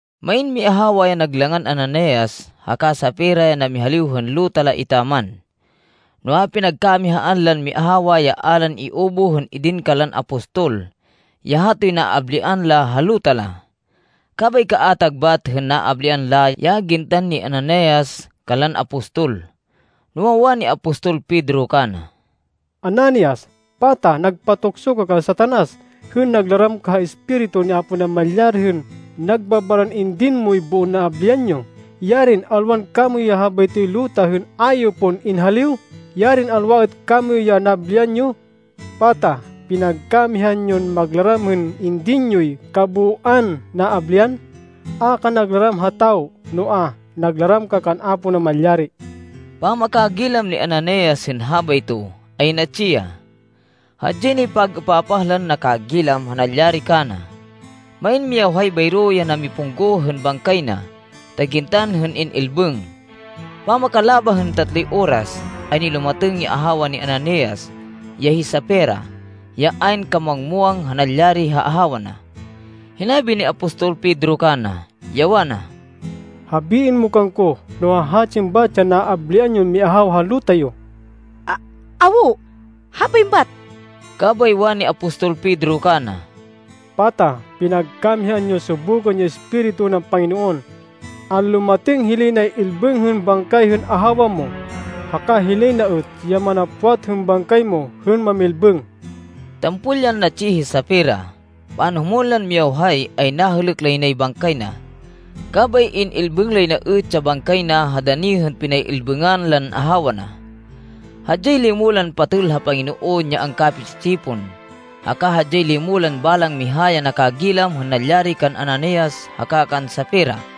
Main miahawa ya nag langan Ananias haka Safira ya namihaliw hên luta la etaman. Noa, pinagkamihaan lan miahawa ya a lan iubuh hên idin kanlan apostol, ya hatoy naablian la ha luta la. Kabay kaatag bat hên naablian la ya gintan ni Ananias kanlan apostol. Noa, wani apostol Pedro kana, “Ananias, pata nagpatukso ka kan Satanas, hên naglaram ka ha Espiritu ni Apo Namalyari hên nagbabaran indin moy boon naablian yo? Yarin alwan kamoyu ya habaytoy luta hên a yo pon inhaliw! Yarin alwa êt kamoyu ya naablian yo! Pata pinagkamihaan yon maglaram hên indin yoy kabooan naablian? A ka naglaram ha tawo, noa, naglaram ka kan Apo Namalyari!” Pamakagilam ni Ananias hên habayto, ay natsi ya. Hadyay nay pag-êpapah lan nakagilam ha nalyari kana. Main miyawhay bayro ya namipungguh hên bangkay na ta gintan hên in-ilbêng. Pamakalabah hên tatloy oras, ay nilumatêng ya ahawa ni Ananias, ya hi Safira, ya ayn kamuwang-muwang ha nalyari ha ahawa na. Hinabi ni apostol Pedro kana, ya wana, “Habiên mo kangko no hahatsin bat ya naablian yon miahawa ha luta yo.” “Awo, habain bat.” Kabay wani apostol Pedro kana, “Pata pinagkamihaan yon subukên ya Espiritu nan Panginoon? Anlumatêng hilay nay-ilbêng hên bangkay hên ahawa mo, haka hilay na êt ya manapwat hên bangkay mo hên mamilbêng.” Tampol yan natsi hi Safira. Panhumwên lan miyawhay, ay nahêlêk lay nay bangkay na. Kabay in-ilbêng lay na êt ya bangkay na ha dani hên pinay-ilbêngan lan ahawa na. Hadyay limo lan patêl ha Panginoon ya angkapi-tsi-tsipon haka hadyay limo lan balang miha ya nakagilam hên nalyari kan Ananias haka kan Safira.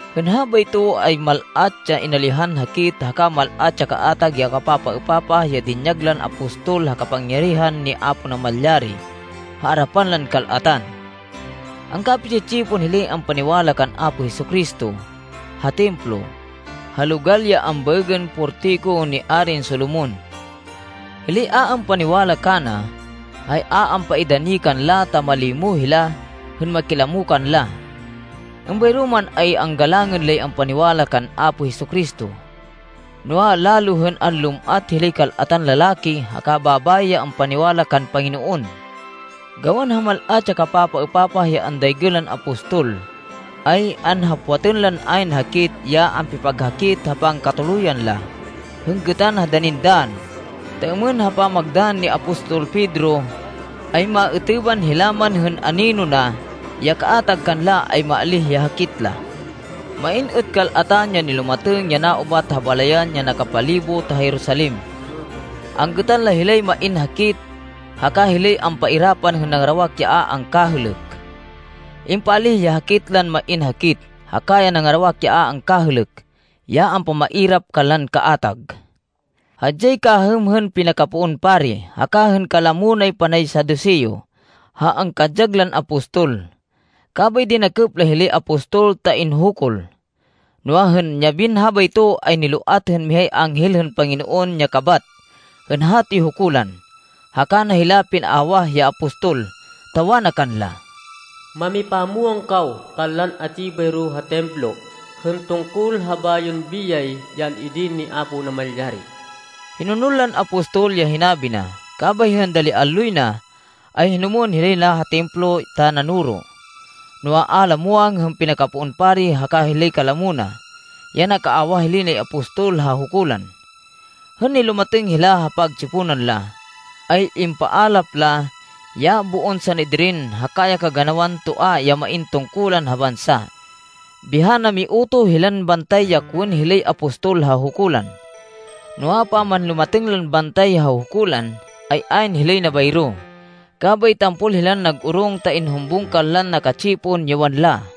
Hên habayto ay mal-at ya inalihan hakit, haka mal-at ya kaatag ya kapapaêpapah ya dinyag lan apostol ha kapangyarihan ni Apo Namalyari ha arapan lan kal-atan. Angkapi-tsi-tsipon hilay ampaniwala kan Apo Jesu-Cristo ha Templo, ha logal ya ambaêgên Portiko ni Arin Solomon. Hilay a ampaniwala kana, ay a ampaidani kanla ta malimo hila hên makilamo kanla. Êmbayro man, ay anggalangên lay ampaniwala kan Apo Jesu-Cristo. Noa, lalo hên anlum-at hilay kal-atan lalaki haka babayi ya ampaniwala kan Panginoon. Gawan ha mal-at ya kapapaêpapah ya andaygên lan apostol, ay anhapwatan lan ayn hakit, ya ampipaghakit, ha pangkatuluyan la, hên gêtan ha danin dann, ta êmên ha pamagdann ni apostol Pedro, ay maêtêban hila man hên anino na ya kaatag kanla, ay maalíh ya hakit la. Main êt kal-atan ya nilumatêng ya naubat ha balayan ya nakapalibot ha Jerusalem. Anggêtan la hilay main hakit haka hilay ampairapan hên nangarawak ya a angkahêlêk. Impaalíh ya hakit lan main hakit, haka ya nangarawak ya a angkahêlêk ya ampamairap kanlan kaatag. Hadyay kahêm hên pinakapoon pari, haka hên kalamo nay panay Saduseo, ha angkadyag lan apostol. Kabay dinakêp la hilay apostol ta inhukul. Noa, hên yabin habayto, ay niloat hên mihay anghel hên Panginoon ya kabat hên hatoy hukulan, haka na hila pinaawah ya apostol, ta wana kanla, “Mamipamwang kaw kanlan atsi bayro ha Templo hên tungkol ha bayon biyay ya an-idin ni Apo Namalyari.” Hinonol lan apostol ya hinabi na, kabay hên dali alloy na, ay hinumwên hilay na ha Templo ta nanoro. Noa, a la muwang hên pinakapoon pari haka hilay kalamo na, ya nakaawah hilay nay apostol ha hukulan. Hên nilumatêng hila ha pagtsiponan la, ay impaalap la ya boon Sanedrin haka ya kaganawan toa ya main tungkulan ha bansa. Biha namiutoh hilan bantay ya kowên hilay apostol ha hukulan. Noa, pamanlumatêng lan bantay ha hukulan, ay ayn hilay na bayro, kabay tampol hilan nag-orong ta inhumbung kanlan naka-tsipon ya wanla,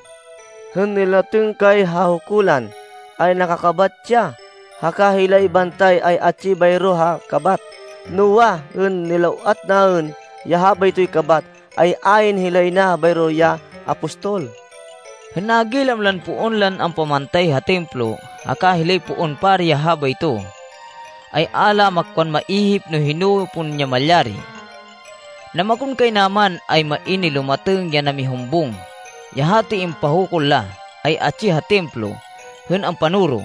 “Hên nilatêng kay ha hukulan, ay nakakabat ya, haka hilay bantay ay atsi bayro ha kabat. Noa, hên niloat naên ya habaytoy kabat, ay ayn hilay na bayro ya apostol!” Hên nagilam lan poon lan ampamantay ha Templo, haka hilay poon pari ya habayto, ay a la makwan maihip no hino pon ya malyari. Namakonkaynaman ay main nilumatêng ya namihumbung, ya hatoy impahukul la, ay atsi ha Templo hên ampanoro.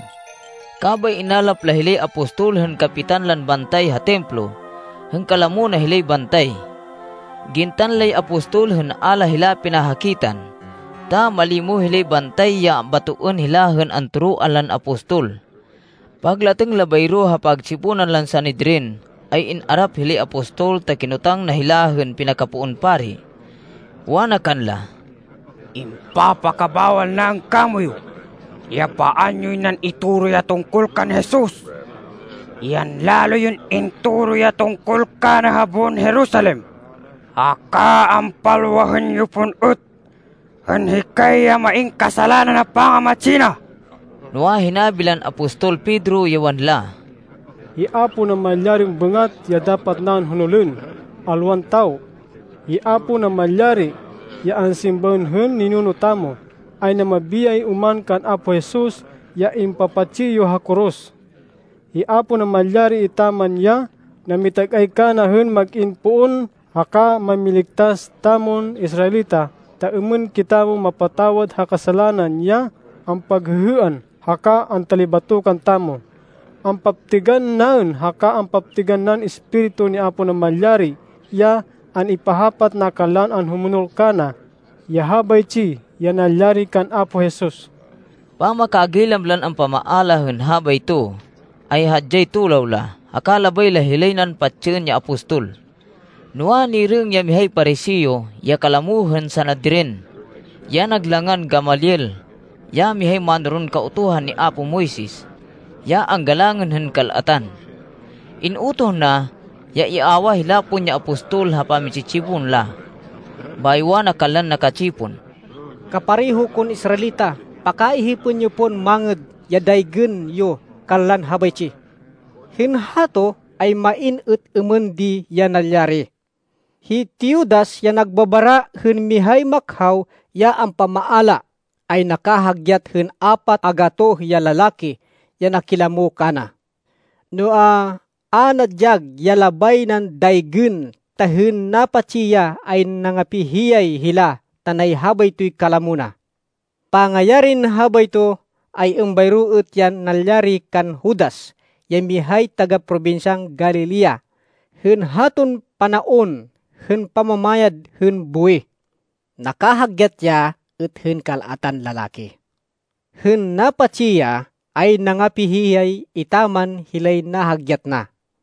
Kabay inalap la hilay apostol, hên kapitan lan bantay ha Templo hên kalamo na hilay bantay. Gintan lay apostol hên a la hila pinahakitan, ta malimo hilay bantay ya batoên hila hên antoroan lan apostol. Paglatêng la bayro ha pagtsiponan lan Sanedrin, ay in-arap hilay apostol, ta kinotang na hila hên pinakapoon pari. Wana kanla, “Impapakabawal naên kamoyu ya paan yoy nan itoro ya tungkol kan Jesus. Yan lalo yon intoro ya tungkol kana ha boon Jerusalem, haka ampalwahên yo pon êt hên hikay ya main kasalanan ha pangamatsi na!” Noa, hinabi lan apostol Pedro, ya wanla, “Hi Apo Namalyarin bêngat ya dapat naên honolên, alwan tawo. Hi Apo Namalyari, ya ansimbaên hên ninuno tamo, ay namabiyay oman kan Apo Jesus ya impapatsi yo ha koros. Hi Apo Namalyari etaman ya namitag-ay kana hên mag-in Poon haka Mámiligtas tamon Israelita, ta êmên kitamo mapatawad ha kasalanan ya ampaghêhêan haka antalibatokan tamo. Ampaptêgan naên, haka ampaptêgan nan Espiritu ni Apo Namalyari, ya an-ipahapat na kanlan anhumonol kana, ya habaytsi ya nalyari kan Apo Jesus.” Pamakagilam lan ampamaala hên habayto, ay hadyay tulaw la, haka labay la hilay nan patsên ya apostol. Noa, nirêng ya mihay Pariseo, ya kalamo hên Sanedrin ya nag langan Gamaliel, ya mihay mánoron Kautuhan ni apo Moises, ya anggalangên hên kal-atan. In-utoh na, ya iawah hila pon ya apostol ha pami-tsi-tsipon la. Bayo wana kanlan naka-tsipon, “Kapareho kon Israelita, pakaihipên yo pon mangêd ya daygên yo kanlan habaytsi. Hên hato ay main êt êmên di ya nalyari. Hi Teudas ya nagbabara hên mihay makhaw ya ampamaala, ay nakahagyat hên apat a gatoh ya lalaki ya nakilamo kana. Noa, a nadyag ya labay nan daygên, ta hên napatsi ya, ay nangapi-hihiyay hila tanay habaytoy kalamo na. Pangayarin habayto, ay êmbayro êt ya nalyari kan Judas, ya mihay taga-probinsyan Galilea, hên haton panaon hên pamamayad hên buwih. Nakahagyat ya êt hên kal-atan lalaki. Hên napatsi ya, ay nangapi-hihiyay etaman hilay nahagyat na.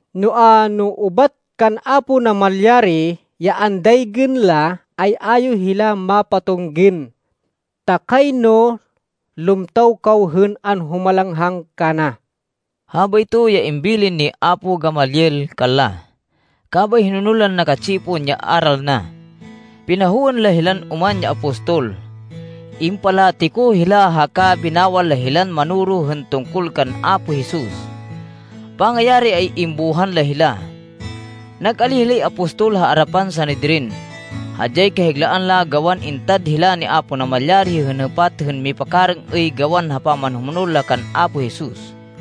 Noa, no ubat kan Apo Namalyari ya andaygên la, ay a yo hila mapatunggên. Ta kayno lumtaw kaw hên anhumalanghang kana!” Habayto ya imbilin ni apo Gamaliel kanla. Kabay hinonol lan naka-tsipon ya aral na. Pinahowên la hilan oman ya apostol. Impalatiko hila haka binawal la hilan manoro hên tungkol kan Apo Jesus. Pangayari, ay imbuhan la hila. Nag-alíh hilay apostol ha arapan Sanedrin. Hadyay kahiglaan la gawan intad hila ni Apo Namalyari hên hêpat hên mipakarêng-êy gawan ha pamanhumonol la kan Apo Jesus.